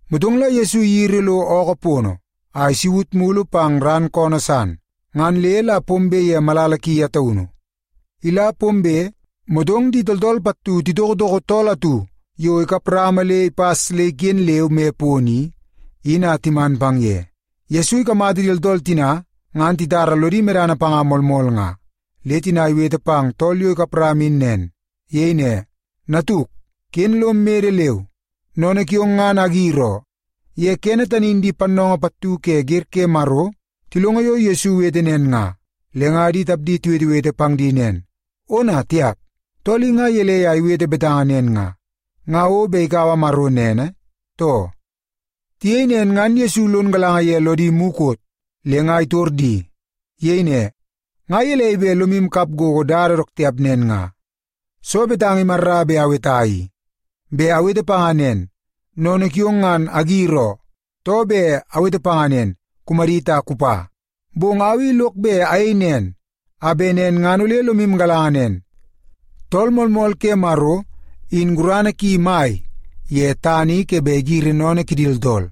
Motong la Yesu iyiri lo ookoo pono, a isaut mulu pang ran koonoo san. Ngan le la pombe ye malala ki ye taunu. Ila pombe, motong di tooltool pattu titokotoko tool atu yo ikap rama le ipas le iken leu moi pono i, in a timan pang ye. Yesu ikamata di tooltool tina, ngan titara lodi medana panga moolmool nga, le tina iwete pang tool yo ikap rama in nen. Iyei ne, “Natuk, ken lom mede leu. Sennene kiong, ngan agir oo.” Ye kene tani in di pannoongoo pattu ke wer ke Maro tilongo yo Yesu iwete nen nga, le nga di tapdi tiwetewete pang di nen, “Ona, tiap! Tool i nga gelei a iwete betanga nen nga? Nga o bet ikaua Maro nene, too?” Tiyei nen ngan Yesu lon galanga ye lodi mukot, le nga itor di. Iyei ne, “Nga gelei bet lomu kap gogo dada dook tiap nen nga? Soo betanga imarra bet aweta i? Bet awete panga nen, ‘Sennene kiong ngan agir oo,’ too bet awete panga nen, ‘Kumadit a kupa’? Bong au i lok bet ayei nen, a bet nen ngan ole lomu galanga nen, Tool Moolmool ke Maro, in gurana ki mai ye tana i ke bet igiri sennene kidi tooltool.”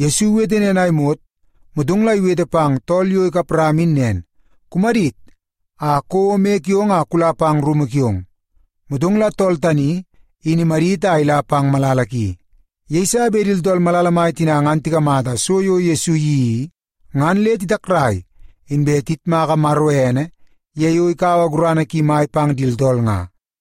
Yesu iwete nen a imot, motong la iwete pang tool yo ikap rama in nen, “Kumadit, a kouo moi kiong a kula pang rumu kiong.” Motong la tool tani, in imadit a ila pang malala ki. Yeiso bet di tooltool malala mai tina ngan tikamata so yo Yesu iyeii i, ngan le titakrai, inbe tiyitmaka Maro ene ye yo ikaua gurana ki mai pang di tooltool nga.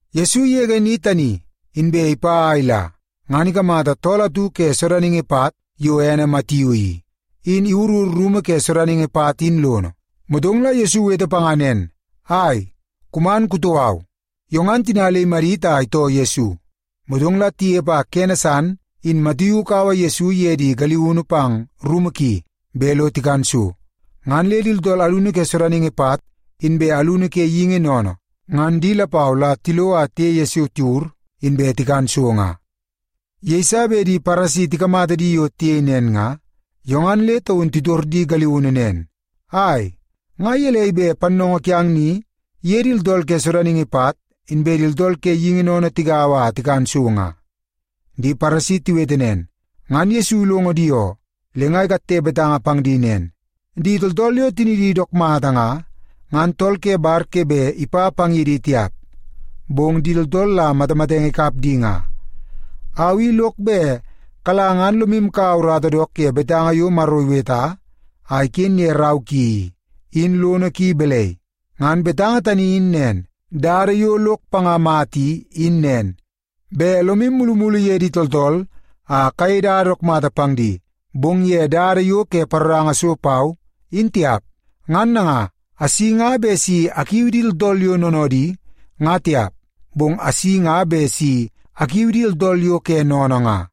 Yesu igege ni tani, inbe ipa a ila, ngan ikamata tool atu ke sodaningi pat yo ene Matiu i, in iwurur rumu ke sodaningi pat in lono. Motong la Yesu iwete panga nen, “Ai, kuman kutoo au.” Yo ngan tina le imadit a itoo Yesu. Motong la tinepe a kene san in Matiu ikaua Yesu iye di galiunu pang rumu ki bet lo tikan so. Ngan le di tooltool alunu ke sodaningi pat, inbe alunu ke geingi sennene, ngan di lapau la tilo a tiye Yesu tiwur, inbe tikan so nga. Yeiso bet di Paresi tikamata di yo tiyei nen nga, yo ngan le taun titor di galiunu nen, “Ai! Nga gelei bet pannoongoo kiang ni iye di tooltool ke sodaningi pat inbe di tooltool ke geingi sennene tigaua a tikan so nga?” Di Paresi tiwete nen, ngan Yesu ilongo di oo. Le nga ikatte betanga pang di nen, “Di tooltool yo tinidi dook mata nga, ngan tool ke bar ke bet ipa pang ye di tiap, bong di tooltool la matamatenge ikap di nga. Au i lok bet kala ngan lomu kaua urata dook ye betanga yo Maro iweta a iken ye rau ki i, in lono ki balai? Ngan betanga tani in nen, ‘Dada yo lok panga mata i, in nen, bet lomu mulumulu ye di tooltool a kayei dada dook mata pang di, bong ye dada yo ke paroranga so pau, in tiap.’ Ngan nanga, asi nga bet si akiu di tooltool yo noonoodi, nga tiap, bong asi bet si akiu di tooltool yo ke sennene nga.”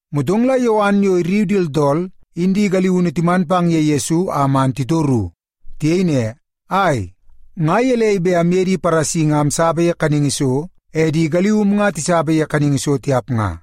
Motong la Yowan yo irriu di tooltool in di galiunu timan pang ye Yesu a man titoru. Tiyei ne, “Ai, nga gelei bet amye di Paresi nga amsapa ye kaningi so, e di galium nga tisapa ye kaningi so tiap nga?”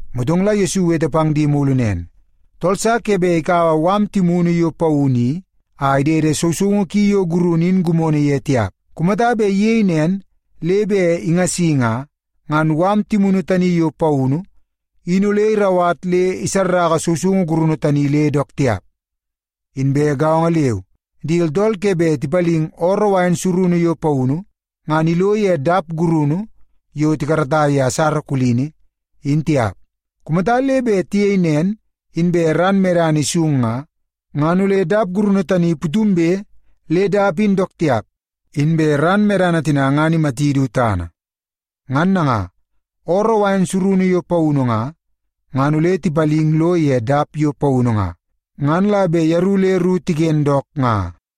Motong la Yesu iwete pang di mulu nen, “Tool sa ke bet ikaua mala timunu yo paunu i a idede sousoungu ki yo gurunu in gimono ye tiap. Kumata bet iyei nen le bet ingasi nga, ngan mala timunu tani yo paunu i, in ole irauwat le isarraka sousoungu gurunu tani le dook tiap. Inbe gaongo leu, di tooltool ke bet tipaling ooroo wain surunu yo paunu, ngan ilo ye dap gurunu yo tikarata ye asara kulini, in tiap. Kumata le bet tiyei nen, inbe ran medana isung nga, ngan ole dap gurunu tani putumbe le dap in dook tiap, inbe ran medana tina ngan imati du tana. Ngan nanga, ooroo wain surunu yo paunu nga, ngan ole tipaling lo ye dap yo paunu nga, ngan la bet yeru le ru tiken dook nga.”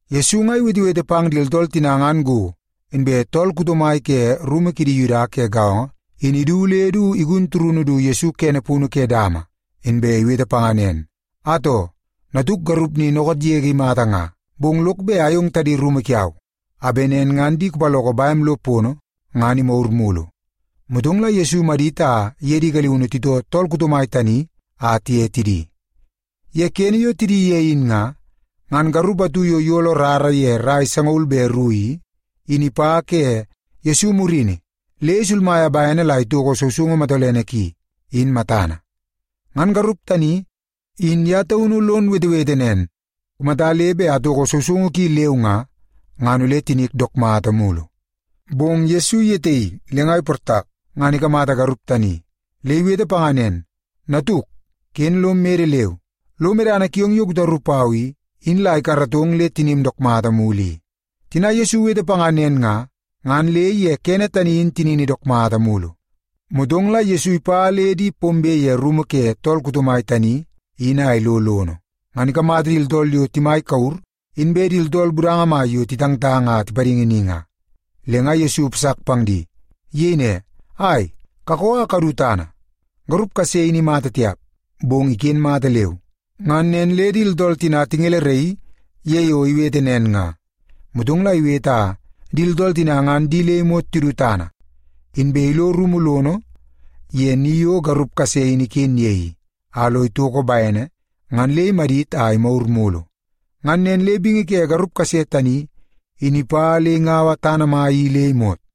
Yesu nga iwetewete pang di tooltool tina ngan go, inbe tool kuto mai ke rumu kidi Yuda ke gaongo in idu le du igun turunu du Yesu kene punu ke dama, inbe iwete panga nen, “Atoo, natuk garup ni dookoot yege imata nga. Bong lok bet ayong tadi rumu kiau, a bet nen ngan di kupaloko bem lo pono, ngan imagur mulu.” Motong la Yesu imadit a iye di galiunu titoo tool kuto mai tani a tiye tidi. Ye kene yo tidi ye in nga, ngan garup atu yo iyolo rara ye rai sangaul be ru i, in ipa ke Yesu murini le isulmaia bene la itoko sousoungu matolene ki, in matana. Ngan garup tani, in ye taunu lon wetewete nen, “Kumata le bet atoko sousoungu ki leu nga, ngan ole tinik dook mata mulu.” Bong Yesu iyetaii le nga iportak ngan ikamata garup tani. Le iwete panga nen, “Natuk, ken lom mede leu. Lo medana kiong yo kutaru pau i, in la ikaratong le tinim dook mata mulu i.” Tina Yesu iwete panga nen nga, ngan le ye kene tani in tinini dook mata mulu. Motong la Yesu ipa le di pombe ye rumu ke tool kuto mai tani in a ilo lono, ngan ikamata di tooltool yo timai kure, inbe di tooltool budanga mai yo titangtang a tipadingi ni nga. Le nga Yesu ipasak pang di. Iyei ne, “Ai, kakoo a kadu tana! Garup kase in imata tiap, bong iken mata leu.” Ngan nen le di tooltool tina tingeleraii ye yo iwete nen nga. Motong la iwete a di tooltool tina ngan di le imot tidu tana, inbe ilo rumu lono ye ni yo garup kase in iken ye i, a lo itoko bene, ngan le imadit a imagur mulu. Ngan nen le bingi ke garup kase tani, in ipa le ingaua tana mai i le imot.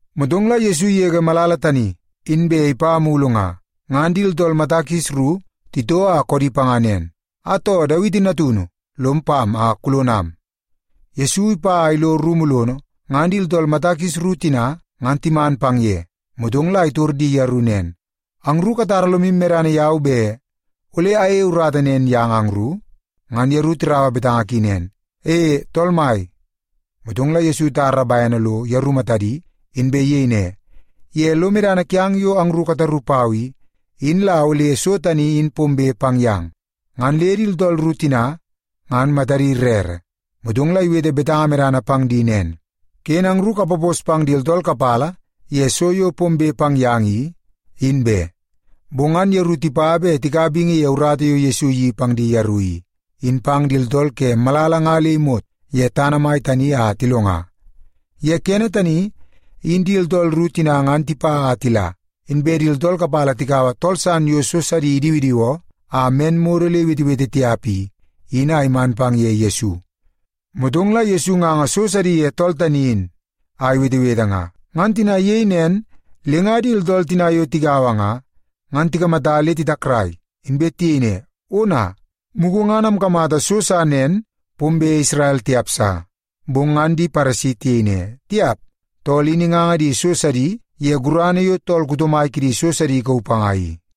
Motong la Yesu igege malala tani, inbe ipa mulu nga. Ngan di tooltool mata kis ru titoo a koodi panga nen, “Atoo, Dawiti natunu! Lom pam a kulonam.” Yesu ipa a ilo rumu lono, ngan di tooltool mata kis ru tina ngan timan pang ye. Motong la itor di yeru nen, “Angru katara lomu medana yau bet ole ayeie urata nen yang angru?” Ngan yeru tiraua betanga ki nen, “E, Tool Mai.” Motong la Yesu itar bene lo yeru matadi, inbe iyei ne, “Ye lo medana kiang yo angru kataru pau i, in la ole so tani in pombe pang yang.” Ngan le di tooltool ru tina ngan matadi rere. Motong la iwete betanga medana pang di nen, “Ken angru kapapos pang di tooltool kapala ye so yo pombe pang yang i, in be.” Bong ngan yeru tipa bet tikaua bingi ye urata yo Yesu iyeii pang di yeru i, in pang di tooltool ke malala nga le imot ye tana mai tani a tilonga. Ye kene tani, in di tooltool ru tina ngan tipa a tila, inbe di tooltool kapala tikaua tool san yo so sidi idiwidiwoo a men modo le iwetewete tiap i, in a timan pang ye Yesu. Motong la Yesu inganga so sidi ye tool tani in a iwetewete nga. Ngan tina iyei nen, le nga di tooltool tina yo tigaua nga, ngan tikamata le titakrai, inbe tiyei ne, “Ona! Mugu ngan amkamata so sa nen pombe Isrel tiap sa.” Bong ngan di Paresi tiyei ne, “Tiap! Tool in inganga di so sidi ye gurana yo tool kuto mai kidi so sidi ikauu panga i.”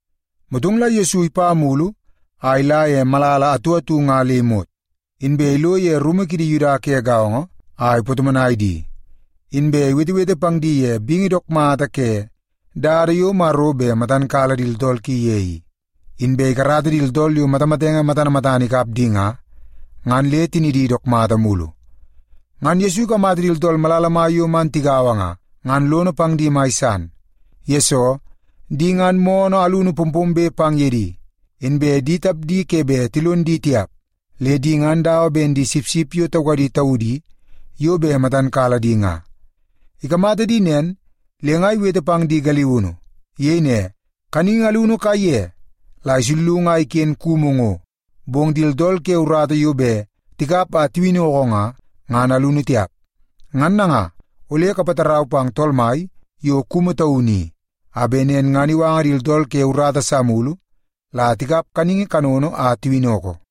Motong la Yesu ipa mulu a ila ye malala atu atu nga le imot, inbe ilo ye rumu kidi Yuda ke gaongo a ipatomonai di, inbe iwetewete pang di ye bingi dook mata ke dada yo Maro bet matan kala di tooltool ki ye i. Inbe ikarata di tooltool yo matamatenge matana matana ikap di nga, ngan le tinidi dook mata mulu. Ngan Yesu ikamata di tooltool malala mai yo man tigaua nga, ngan lono pang di mai san. Yesoo, di ngan moonoo alunu pompombe pang ye di, inbe di tapdi ke bet tilon di tiap, le di ngan dawa ben di sipsip yo taukadi taudi yo bet matan kala di nga. Ikamata di nen, le nga iwete pang di galiunu. Iyei ne, “Kaningi alunu kaiye la isullungu a iken kumu ngo, bong di tooltool ke urata yo bet tikap a tiwinnoko nga, ngan alunu tiap. Ngan nanga, ole kapatarau pang Tool Mai yo kumu taunu i, a bet nen ngan iwanga di tooltool ke urata sa mulu la tikap kaningi kanono a tiwinnoko.”